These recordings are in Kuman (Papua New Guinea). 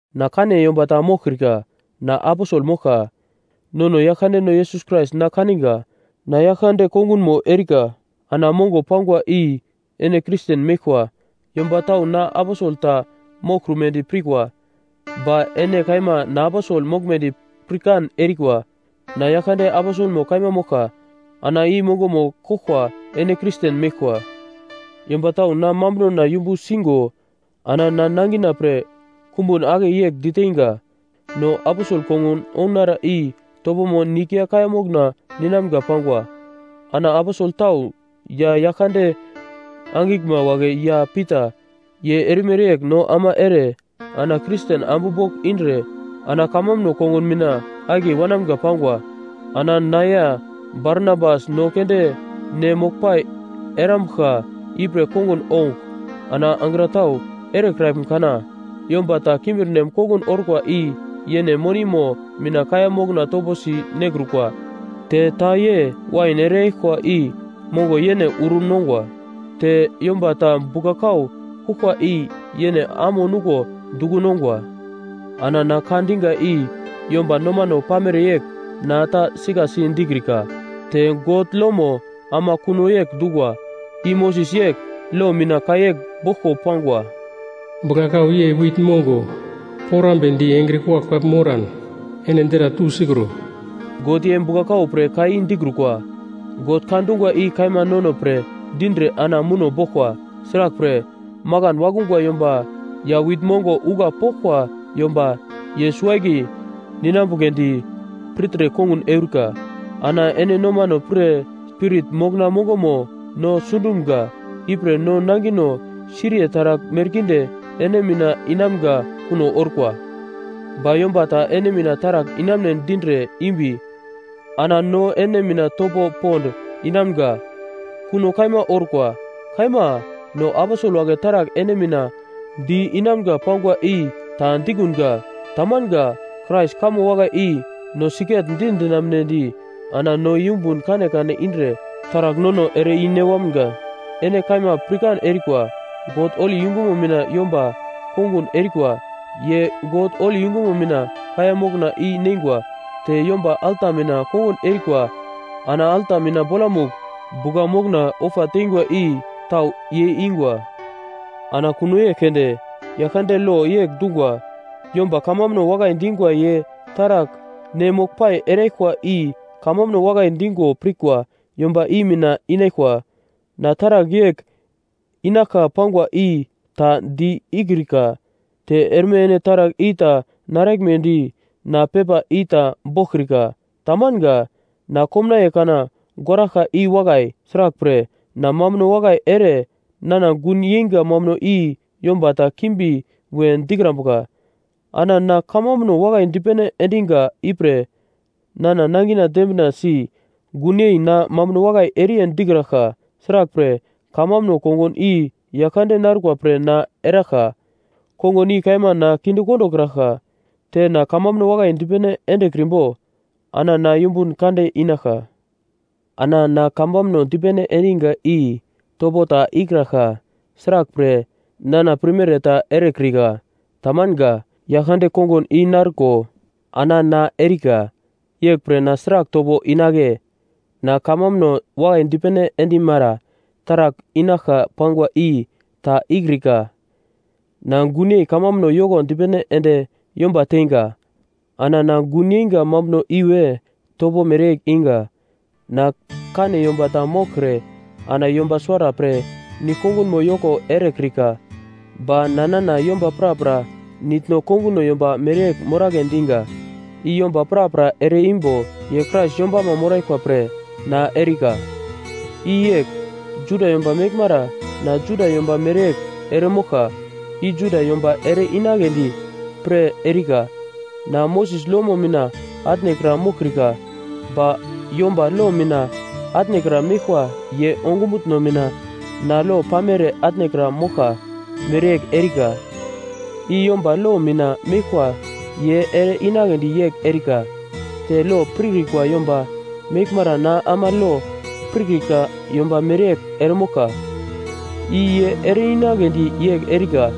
Na kane yomba ta moglkrika. Na aposel moglka. Nono Yaglkandeno Yesus Krais na kaniga. Na Yaglkande kongun erika, ana mongo pangwa i ene Kristen meglkwa. Yomba tau na aposel ta moglkrumedi pirkwa, ba ene kaima na aposel moglmedi pirkan erikwa. Na Yaglkande aposelmo kaima moglka, ana i mongomo koglkwa ene Kristen meglkwa. Yomba tau na mambunona yumbu singo ana na nangina pre kumbun ake yegl diteinga: No aposel kongun ounara i topomo nigl ya kaiya mokna ninamga pangwa. Ana aposel tau ya Yaglkande angiglma wagle ya Pita, ye erimere yegl no ama ere ana Kristen ambu bogl indre ana kamambuno kongun mina akiye wanamga pangwa. Ana na ya Barnabas no keunde ne moglpai erambuglka ipre kongun ougl, ana angra tau erekraglm kana? Yomba ta kimbirnem kongun orkwa i yene monimo mina kaiya mokna toposi nekrukwa, te ta ye wain ereyaglkwa i mongo yene uro nongwa, te yomba ta bugla-kau kuglkwa i yene amo nuglo duko nongwa. Ana na ka diga i yomba nomano pamere yegl na ta sikasi dikrika. Te God lomo ama kuno yegl dungwa. I Moses yegl lo mina ka yegl boglko pangwa: “Bugla-kau ye wit mongo porambedi engre kuglagl-pagl moran ene dra tusikro.” God ye bugla-kau pre ka i dikrukwa. God ka dungwa i kaima nono pre dindre ana muno boglkwa. Sraglpre, makan wakungwa yomba ya wit mongo ougla poglkwa yomba, ye suwo-akiye ninambugledi pirtre kongun eurika. Ana ene nomano pre spirit mokna mongomo no sundumga, ipre no nangino siriye taragl merkinde ene mina inamga kuno orkwa. Ba yomba ta ene mina taragl inamune dindre imbi, ana no ene mina topo pond inamga kuno kaima orkwa. Kaima, no aposel wagle taragl ene mina di-inamga pangwa i ta di-ikunga, tamanga. Krais kamo wakai i no sigetdi dinamunedi ana no yumbun kanekane indre taragl nono ere i-ne wamga. Ene kaima pirkan erikwa, God holi yungumo mina yomba kongun erikwa, ye God holi yungumo mina kaiya mokna i-neingwa. Te yomba alta mina kongun erikwa ana alta mina bolamugl bugla mokna ofa teingwa i tau ye ingwa. Ana kuno yegl keunde Yaglkande lo yegl dungwa: Yomba kamambuno wakai dingwa ye taragl ne moglpai eraglkwa i kamambuno wakai dingo pirkwa yomba i mina inaglkwa. Na taragl yegl inaglka pangwa i ta di-ikrika. Te erme ene taragl i ta naraglmedi na pepa i ta boglkrika, tamanga. Na komnaiye kana goraglka i wakai! Sraglpre, na mambuno wakai ere nana gun yeinga mambuno i yomba ta kimbi we dikrambuka. Ana na kamambuno wakai dipene endiga ipre nana nangina dembinasi gunyei na mambuno wakai eriye dikraglka. Sraglpre, kamambuno kongun i Yaglkande narkwa pre na eraglkwa, kongun i kaima na kinde kondokraglka. Te na kamambuno wakai dipene endekrimbo ana na yumbun kande inaglka. Ana na kamambuno dipene endiga i topo ta ikraglka. Sraglpre, nana pirmere ta erekrika. Tamanga. Yaglkande kongun i narko ana na erika. Yeglpre na sragl topo inagle? Na kamambuno wakai dipene endemara taragl inaglka pangwa i ta ikrika. Na gunyei kamambuno yoko dipene ende yomba teinga. Ana na gun yeinga mambuno iwe topo mereyegl iga. Na kane yomba ta moglkre ana yomba suwara pre nigl-kongunmo yoko erekrika. Ba na nana yomba prapra nitno konguno yomba mereyegl moragle diga. I yomba prapra ere-imbo ye Krais yombama moraglkwa pre na erikwa. I yegl: Juda yomba meglmara na Juda yomba mereyegl eremoglka, i Juda yomba ere-inagledi pre erika. Na Moses lomo mina atnekra moglkrika ba yomba lo mina atnekra meglkwa ye ongumutno mina na lo pamere atnekra moglka mereyegl erika. I yomba lo mina meglkwa ye ere-inagledi yegl erika. Te lo pirkrikwa yomba meglmara na ama lo pirkrika yomba mereyegl eremoglka, i ye ere-inagledi yegl erika.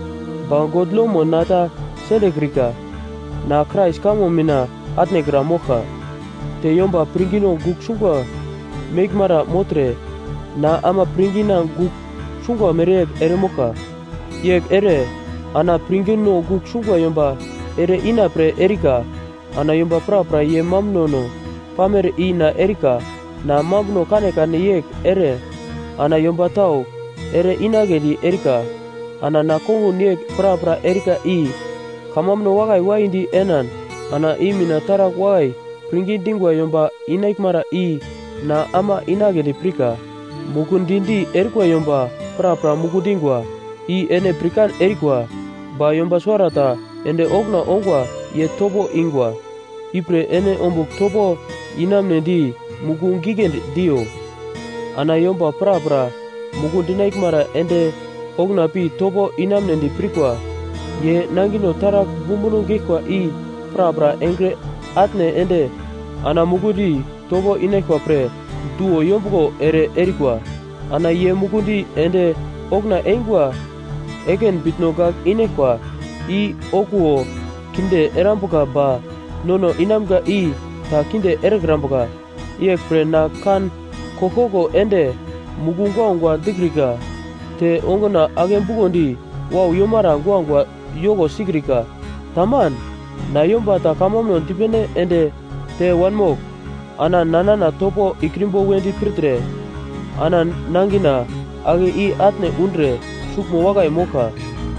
Ba God lomo na ta sendekrika, na Krais kamo mina atnekra moglka. Te yomba pirngino gugl sungwa meglmara mogltre na ama pirngina gugl sungwa mereyegl eremoglka. Yegl ere ana pirngino gugl sungwa yomba ere-ina pre erika. Ana yomba prapra ye mambunono pamere i na erika, na mambuno kanekane yegl ere ana yomba tau ere-inagledi erika. Ana na kongun yegl prapra erika i kamambuno wakai waidi enan ana i mina taragl wakai pirngi dingwa yomba inaglmara i na ama inagledi pirka. Mukundi-di erikwa yomba prapra muku dingwa, i ene pirkan erikwa. Ba yomba suwarata ende okuna ongwa ye topo ingwa. Ipre ene ombugl topo inamunedi muku giglendi diyo. Ana yomba prapra muku dinaglmara ende okuna pi topo inamunedi pirkwa, ye nangino taragl bumbuno geglkwa i prapra engre atne ende ana mukundi topo inaglkwa pre duwo yombuglo ere erikwa. Ana ye mukundi ende okuna eingwa ekin bitno gagl inaglkwa, i okuwo kinde erambuka ba nono inamga i ta kinde erekrambuka. Yeglpre na kan koglkoglo ende muku guagua dikrika, te onguna ake bukondi wau yomara guagua yoko sikrika. Taman. Na yomba ta kamambuno dipene ende te wanmogl ana na nana topo ikrimbo wedi pirtre ana nangina ake i-atne undre suglmo wakai moglka.